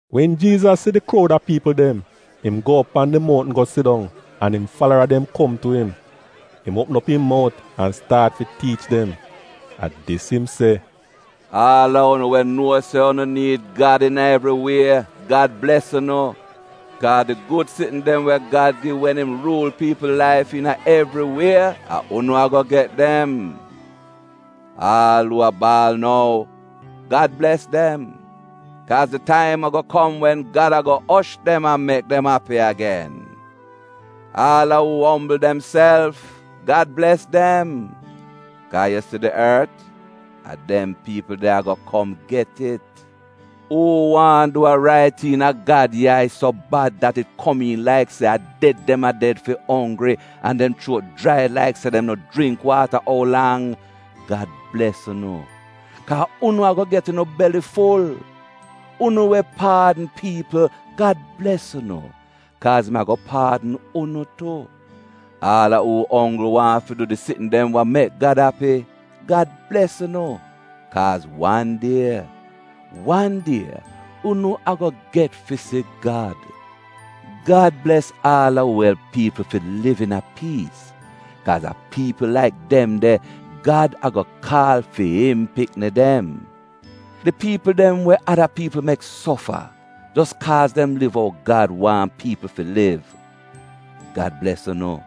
Wen Jiizas si di kroud a piipl dem, im go op pan di mountn go sidong, an im falara dem kom tu im. Im uopm op im mout an staat fi tiich dem. A dis im se: “Aal a unu we nuo se unu niid Gad iina evri wie, Gad bles unu, kaa di gud sitn dem we Gad gi wen im ruul piipl laif iina evri wie, a unu ago get dem. Aal a uu a baal nou, Gad bles dem, kaaz di taim ago kom wen Gad ago osh dem an mek dem api agen. Aal a uu ombl demself, Gad bles dem, kaa yu si di ort, a dem piipl de a ago kom get it. Uu waahn du wa rait iina Gad yai so bad, dat it komiin laik se a ded dem a ded fi onggri an dem chuot jrai laik se dem no jringk waata ou lang, Gad bles unu, kaa unu ago get unu beliful Unu we paadn piipl, Gad bles unu, kaaz im ago paadn unu tu. Aal a uu onggl waahn fi du di sitn dem we mek Gad api, Gad bles unu, kaaz wan die, wan die, unu ago get fi si Gad. Gad bles aal a uu elp piipl fi liv iina piis, kaaz a piipl laik dem de Gad ago kaal fi im pikni dem. Di piipl dem we ada piipl mek sofa jos kaaz dem liv ou Gad waahn piipl fi liv, Gad bles unu,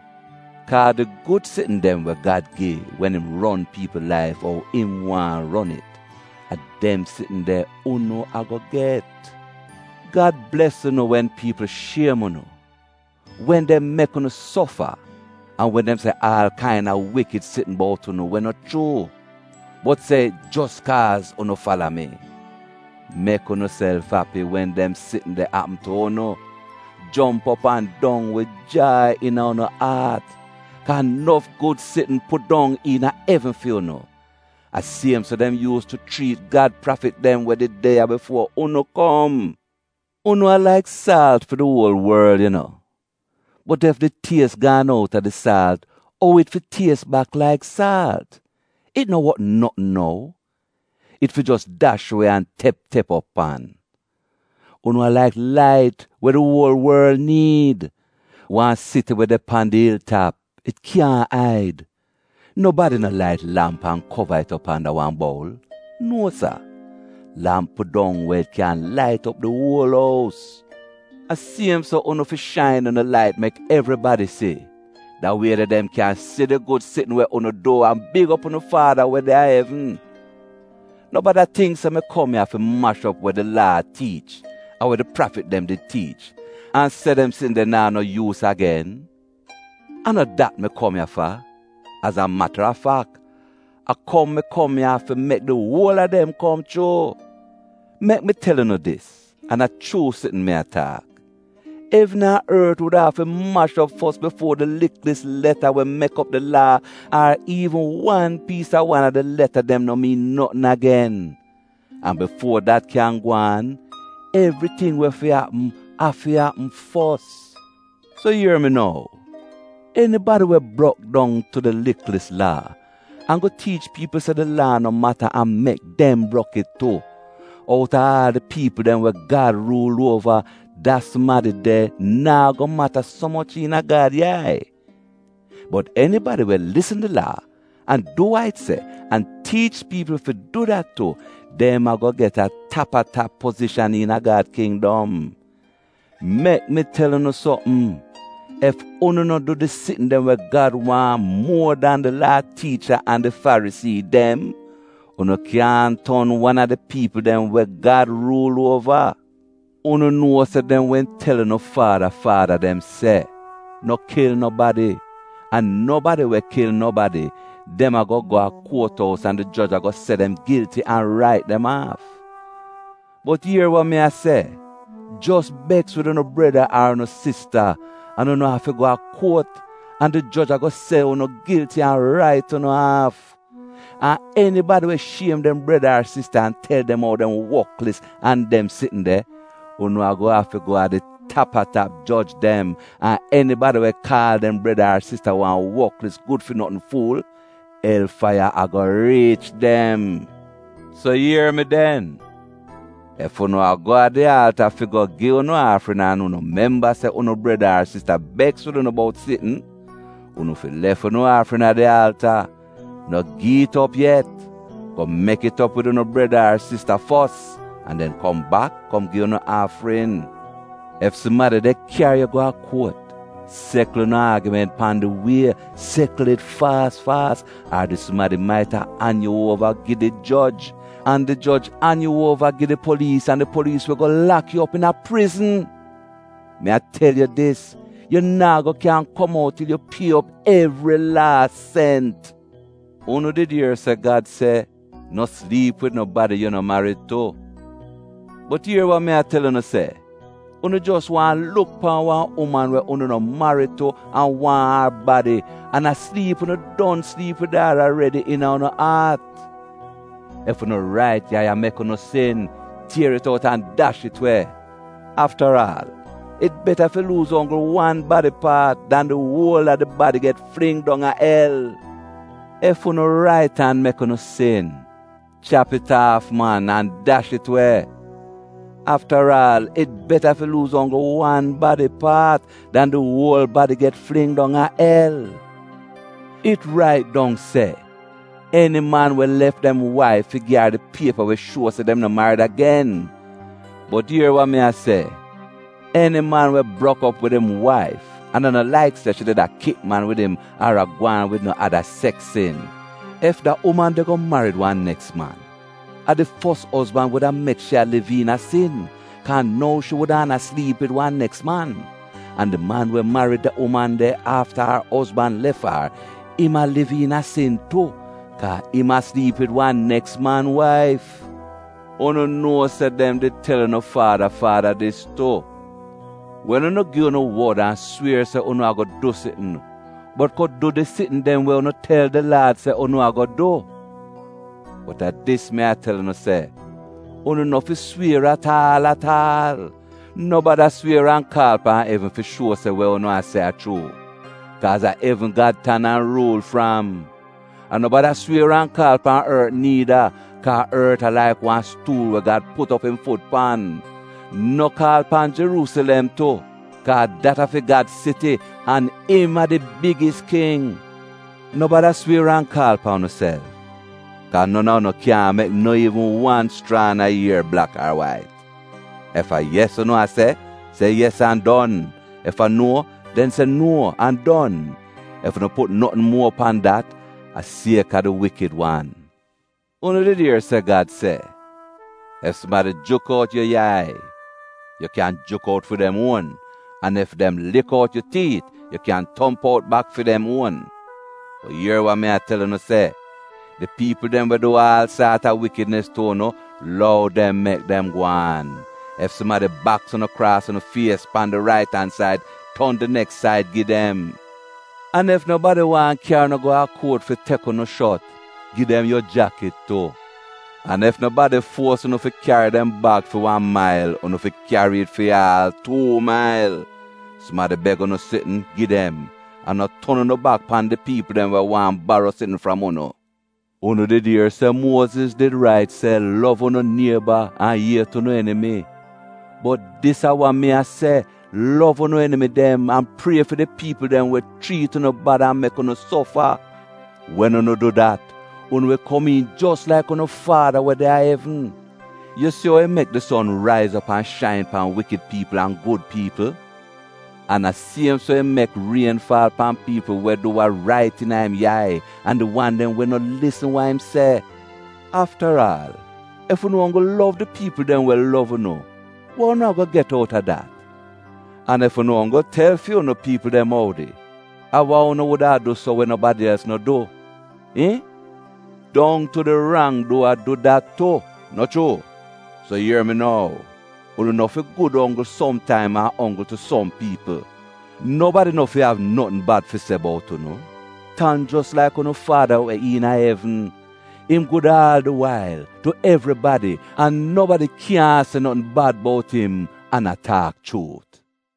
kaa di gud sitn dem we Gad gi wen im ron piipl laif ou im waahn ron it, a dem sitn de unu ago get. Gad bles unu wen piipl shiem unu, wen dem mek unu sofa an wen dem se aal kaina wikid sitn bout unu we no chuu — bot se it jos kaaz unu fala mi. Mek unuself api wen dem sitn de apm tu unu; jomp op an dong wid jai iina unu aat, kaa nof gud sitn pudong iina evn fi unu. A siem so dem yuus tu chriit Gad prafit dem we did de ya bifuo unu kom. “Unu a laik saalt fi di uol worl yu no. Bot ef di ties gaan out a di saalt, ou it fi ties bak laik saalt? It no wot notn nou. It fi jos dash we an tep tep op pan. “Unu a laik lait we di uol worl niid. Wan siti we de pan di il tap, it kyaahn aid. Nobadi no lait lamp an kova it op anda wan boul — nuo sa. Lamp pudong we it kyan lait op di uol ous. A siem so unu fi shain unu lait mek evribadi si, da wie de dem kyan si di gud sitn we unu du an big op unu Faada we de a evn. “No bada tingk se mi kom ya fi mash op we di Laa tiich an we di prafit dem did tiich, an se dem sitn de naa no yuus agen. A no dat mi kom ya fa, az a matarafak, a kom mi kom ya fi mek di uol a dem kom chuu. Mek mi tel unu dis, an a chuu sitn mi a taak: evn an ort wuda afi mash op fos bifuo di liklis leta we mek op di Laa, ar iivn wan piis a wan a di leta dem, no miin notn agen. An bifuo dat kyan gwaan, evriting we fi apm, afi apm fos. So ier mi nou, enibadi we brok dong tu di liklis Laa, an go tiich piipl se di Laa no mata an mek dem brok it tu, out a aal di piipl dem we Gad ruul uova, da sumadi de naa go mata so moch iina Gad yai. Bot enibadi we lisn di Laa an du wa it se, an tiich piipl fi du dat tu, dem ago get tap-a-tap pozishan iina Gad kindom. Mek mi tel unu sopm, ef unu no du di sitn dem we Gad waahn muo dan di Laa tiicha an di Farisii dem, unu kyaahn ton wan a di piipl dem we Gad ruul uova. “Unu nuo se dem wehn tel unu faada faada dem se, ‘No kil nobadi’ an ‘nobadi we kil nobadi, dem ago go a kuot ous an di joj ago se dem gilti an rait dem aaf.’ Bot ier wa mi a se, jos beks wid unu breda ar unu sista, an unu afi go a kuot, an di joj ago se unu gilti an rait unu aaf! An enibadi we shiem dem breda ar sista an tel dem ou dem woklis an dem sitn de, unu ago afi go a di tap-a-tap joj dem, an enibadi we kaal dem breda ar sista wan woklis gud fi notn fuul — el faiya ago riich dem. “So ier mi den, ef unu a go a di alta go gi unu aafrin an unu memba se unu breda ar sista beks wid unu bout sitn, unu fi lef unu aafrin a di alta — no gi it op yet. Go mek it op wid unu breda ar sista fos an den kom bak kom gi unu aafrin. “Ef sumadi de kyari yu go kuot, sekl unu aagiment pan di wie, sekl it faas faas, ar di sumadi maita an yu uova gi di joj, an di joj an yu uova gi di poliis an di poliis wi go lak yu op iina prizn. Mi a tel yu dis, yu naa go kyan kom out til yu pie op evri laas sent. “Unu did ier se Gad se, ‘No sliip wid nobadi yu no marid tu.’ Bot ier wa mi a tel unu se, unu jos waahn luk pan wan uman we unu no marid tu an waahn ar badi, an a sliip unu don sliip wid ar aredi iina unu aat. Ef unu rait yai a mek unu sin, tier it out an dash it we! Aftaraal it beta fi luuz onggl wan badi paat, dan di wol a di badi get fling dong a el. Ef unu rait an mek unu sin, chap it aaf man an dash it we! Aftaraal it beta fi luuz onggl wan badi paat, dan di wol badi get fling dong a el. “It rait dong se, ‘Eni man we lef dem waif fi gi ar di piepa we shuo se dem no marid agen.’ Bot ier wa mi a se: eni man we brok op wid im waif, an a no laik se shi did a kip man wid im ar a gwaan wid no ada seks sin, ef da uman de go marid wan neks man, a di fos ozban wuda mek shi a liv iina sin kaa nou shi wudaana sliip wid wan neks man. An di man we marid da uman de afta ar ozban lef ar, im a liv iina sin tu, kaa im a sliip wid wan neks man waif. “Unu nuo se dem did tel unu faada faada dis tu, ‘Wen unu gi unu wod an swier se unu ago du sitn, unu no fi brok unu pramis, bot go du di sitn dem we unu tel di Laad se unu ago du.’ Bot a dis mi a tel unu se, unu no fi swier at aal at aal. No bada swier an kaal pan evn fi shuo se wa unu a se a chuu, kaaz a evn Gad tan an ruul fram. An no bada swier an kaal pan ort niida, kaa ort a laik wan stuul we Gad put op im fut pan; no kaal pan Jeruusilem tu kaa dat a fi Gad siti, an im a di bigis king. No bada swier an kaal pan unuself, kaa non a unu kyaahn mek no iivn wan schraan a ier blak ar wait. Ef a ‘yes’ unu a se, se ‘yes’ an don, ef a ‘nuo’ — den se ‘nuo’ an don. Ef unu put notn muo pan dat, a sieka di Wikid Wan. “Unu did ier se Gad se, ‘Ef sumadi juk out yu yai, yu kyan juk out fi dem uon, an ef dem lik out yu tiit, yu kyan tomp out bak fi dem uon.’ Bot ier wa mi a tel unu se, di piipl dem we du aal saat a wikidnis tu unu, lou dem mek dem gwaan. Ef sumadi baks unu kraas unu fies, pan di rait an said, ton di neks said gi dem. An ef nobadi waahn kyari unu go kuot fi tek unu shot, gi dem yu jakit tu. An ef nobadi fuos unu fi kyari dem bag fi wan mail, unu fi kyari it fi aal tuu mail. Sumadi beg unu sitn, gi dem, an no ton unu bak pan di piipl dem we waahn baro sitn fram unu. “Unu did ier se Muoziz did rait se, ‘Lov unu nieba’ an ‘Iet unu enimi.’ Bot dis a wa mi a se, lov unu enimi dem an prie fi di piipl dem we chriit unu bad an mek unu sofa. Wen unu du dat, unu wi komiin jos laik unu Faada we de a evn. Yu si ou im mek di son raiz op an shain pan wikid piipl an gud piipl? An a siem so im mek rien faal pan piipl we du wa rait iina im yai an di wan dem we no lisn wa im se. Aftaraal, ef unu onggl lov di piipl dem we lov unu, wa unu ago get out a dat? An ef unu onggl tel fu'unu piipl dem oudi, a wa unu wuda du so we nobadi els no du? Iihn? Dong tu di rang-duwa du dat tu, no chuu? So ier mi nou, unu no fi gud onggl som taim an onggl tu som piipl; nobadi no fi av notn bad fi se bout unu, tan jos laik unu faada we iina evn — im gud aal di wail, tu evribadi, an nobadi kyaahn se notn bad bout im an a taak chuut.”